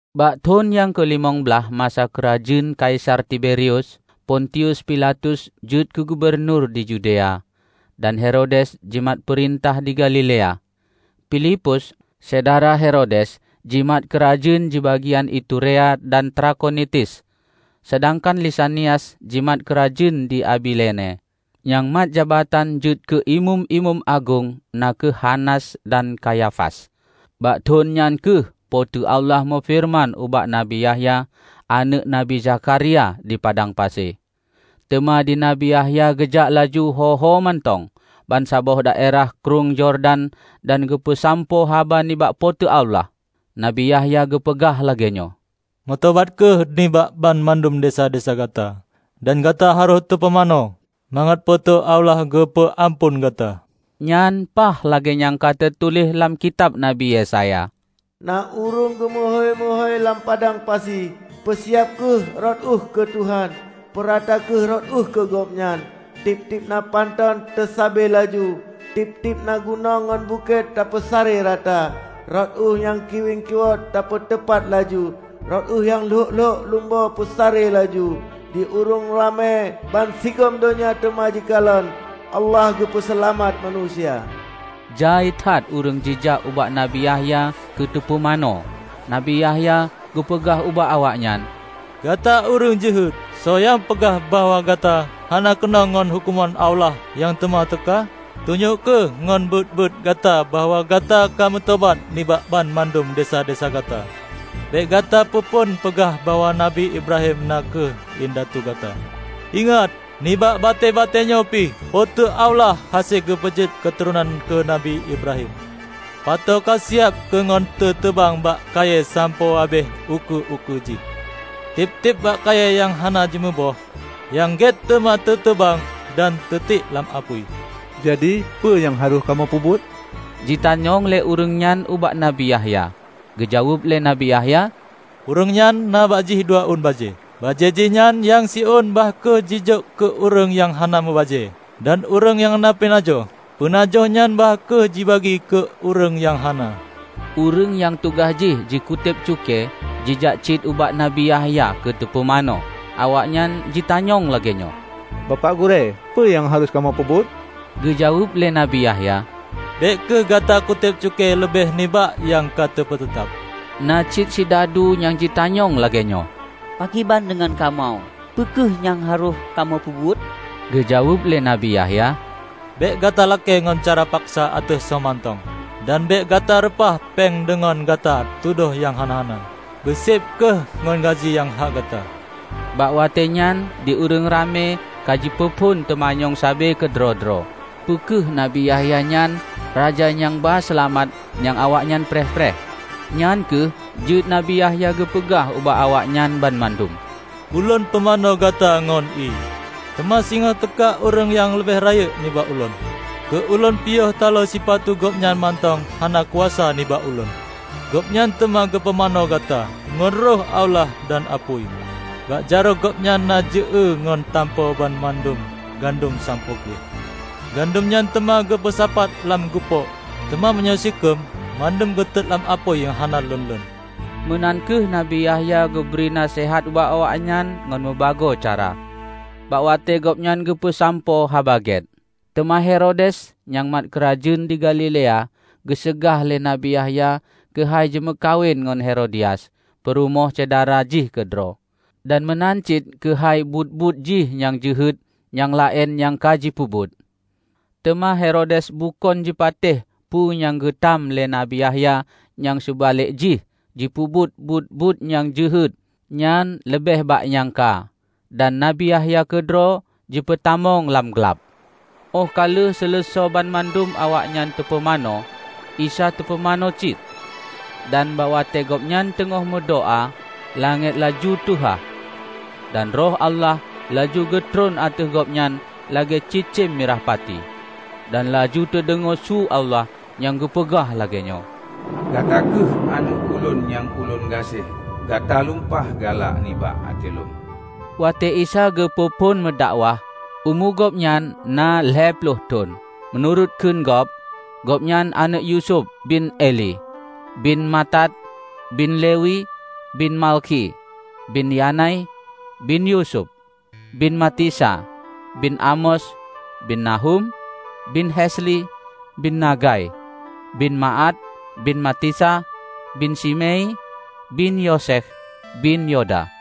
Bak thon nyang keulimong blaih masa keurajeuen Kaisar Tiberius, pontius Pilatus jeuet keugubunur di Yudea, dan Herodes jimat peurintah di Galilea, Filipus, syedara Herodes jimat keurajeuen dibagian Iturea dan Trakhonitis, seudangkan Lisanias jimat keurajeuen di Abilene. Nyang mat jabatan jeuet keu Imeum-imeum agong na kheueh Hanas dan Kayafas. Bak thon nyan kheueh Po teu Allah meufeureuman ubak Nabi Yahya, aneuëk Nabi Zakharia di padang pasi. Teuma di Nabi Yahya geujak laju ho-ho mantong bansaboh daerah Krueng Yordan dan geupeusampoe haba nibak Po teu Allah. Nabi Yahya geupeugah lagée nyoe, "Meutobat kheueh nibak banmandum desya-desya gata, dan gata harôh teupumanö, mangat Po teu Allah geupeu amphon gata." Nyan paih lagée nyang ka teutuléh lam kitab Nabi Yesaya: "Na ureuëng geumeuhôi-meuhôi lam padang pasi, 'Peusiab kheueh rot ueh keu Tuhan, peurata kheueh rot ueh keu Gobnyan. Tieb-tieb na pantôn taseubée laju, tieb-tieb na gunong ngon bukét teupeusaré rata. Rot ueh nyang kiwieng kiwot tapeuteupat laju, rot ueh nyang lhok-lhok lumbo peusaré laju. Di ureuëng ramé bansigom donya teuma jikalon Allah geupeu seulamat manusia!' " Jai that ureuëng jijak ubak Nabi Yahya keu teupumanö. Nabi Yahya geupeugah ubak awaknyan, "Gata ureuëng jeuhet! Soe nyang peugah bahwa gata hana keunong ngon huköman Allah nyang teuma teuka? Tunyok kheueh ngon buet-buet gata bahwa gata ka meutobat nibak banmandum desya-desya gata! Bék gata peuphon peugah bahwa Nabi Ibrahim na kheueh indatu gata. Ingat: Nibak batée-batée nyoe pih Po teu Allah hase geupeujeuet keuturonan keu Nabi Ibrahim! Pato kasiab keu ngon teuteubang bak kayée sampoe habéh ukeue-ukeue jih. Tieb-tieb bak kayée nyang hana jimuboh nyang gét teuma teuteubang dan teutiek lam apui." "Jadi, peue nyang harôh kamoe peubuet?" jitanyong lé ureuëng nyan ubak Nabi Yahya. Geujaweueb lé Nabi Yahya, "Ureuëng nyan na bak jih dua ôn bajée, bajée jihnyan nyang siôn bah kheueh jijok keu ureuëng nyang hana meubajée; dan ureuëng nyang na peunajoh, peunajoh nyan bah kheueh jibagi keu ureuëng nyang hana." Ureuëng nyang tugaih jih jikuteb cukée jijak cit ubak Nabi Yahya keu teupumanö. Awaknyan jitanyong lagée nyoe, "Bapak Gurée, peue nyang harôh kamoe peubuet?" geujaweueb lé Nabi Yahya, "Bék kheueh gata kutéb cukée leubeh nibak nyang ka teupeuteutab." Na cit sidadu nyang jitanyong lagée nyoe, "Pakriban deungon kamoe? Peu kheueh nyang harôh kamoe peubuet?" Geujaweueb lé Nabi Yahya, "Bék gata lakée ngon cara paksa ateueh soe mantong dan bék gata reupah péng deungon gata tudoh nyang hana-hana. Beuséb kheueh ngon gaji nyang hak gata!" Bak watée nyan di ureuëng ramé kajipeuphon teumanyong sabe keudroe-droe, peu kheueh Nabi Yahya nyan Raja nyang ba Seulamat nyang awaknyan preh-preh. Nyang kheueh jeuet Nabi Yahya geupeugah ubak awaknyan banmandum, "Ulôn pumanö gata ngon ié, teuma singoh teuka ureuëng nyang leubeh rayeuk nibak ulôn. Keu ulôn piyôh taloe sipatu Gobnyan mantong hana kuasa nibak ulôn. Gobnyan teuma geupumanö gata ngon Roh Allah dan apui. Bak jaroe gobnyan na jeuée ngon tampo banmandum gandom sampoe gleh. Gandom nyan teuma geupeusapat lam gupôk, teuma meunyoe sikheum mandum geutot lam apui nyang hana lon-lon!" Meunan kheueh Nabi Yahya geubri naseuhat ubak awaknyan ngon mubagoe cara, bak watée gobnyan geupeusampoe Haba Gét. Teuma Herodes, nyang mat keurajeuen di Galilea, geuseugah lé Nabi Yahya keuhai jimeukawen ngon Herodias, peurumoh syedara jih keudroe, dan meunan cit keuhai buet-buet jih nyang jeuhet nyang laén nyang ka jipeubuet. Teuma Herodes bukon jipatéh peue nyang geutam lé Nabi Yahya nyan seubalek jih jipeubuet buet-buet nyang jeuhet nyan leubeh bak nyang ka dan Nabi Yahya keudroe jipeutamong lam glab. Óh ka lheueh seuleusoe banmandum awaknyan teupumanö, Isa teupumanö cit. Dan bak watée gobnyan teungoh meudoá, langét laju teuhah, dan Roh Allah laju geutron ateueh Gobnyan lagée cicém mirah pati. Dan laju teudeungoe su Allah nyang geupeugah lagée nyoe, "Gata kheueh Aneuëk ulôn nyang ulôn gaséh. Gata lumpah galak nibak até lôn." Watée Isa geupeu phon meudakwah, umu gobnyan na lhée ploh thon. Meunurot kheun gob, gobnyan aneuëk Yusuf, bin Eli, bin Matat, bin Lewi, bin Malkhi, bin Yanai, bin Yusuf, bin Matica, bin Amos, bin Nahum, bin Hesli, bin Nagai, bin Maat, bin Matica, bin Simei, bin Yosekh, bin Yoda,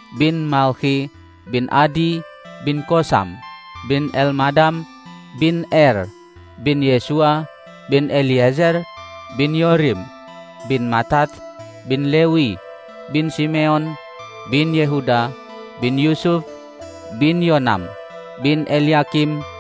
bin Malkhi, bin Adi, bin Kosam, bin Elmadam, bin Er, bin Yesua, bin Eliezer, bin Yorim, bin Matat, bin Lewi, bin Simeon, bin Yehuda, bin Yusuf, bin Yonam, bin Elyakim,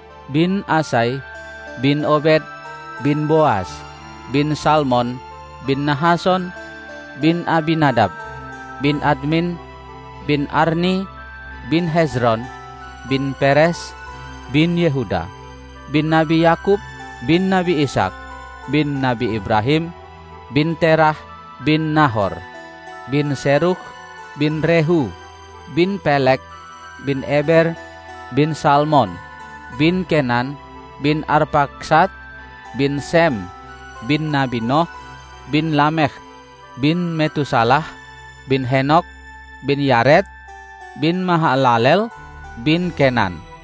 bin Isai, bin Obed, bin Boas, bin Salmon, bin Nahason, bin Abinadab, bin Admin, bin Arni, bin Hezron, bin Peres, bin Yehuda, bin Nabi Yakub, bin Nabi Ishaq, bin Nabi Ibrahim, bin Terah, bin Nahor, bin Serug, bin Rehu, bin Peleg, bin Eber, bin Salmon, bin Kenan, bin Arpakhsad, bin Sem, bin Nabi Noh, bin Lamekh, bin Metusalah, bin Henokh, bin Yared, bin Mahalaleel, bin Kenan,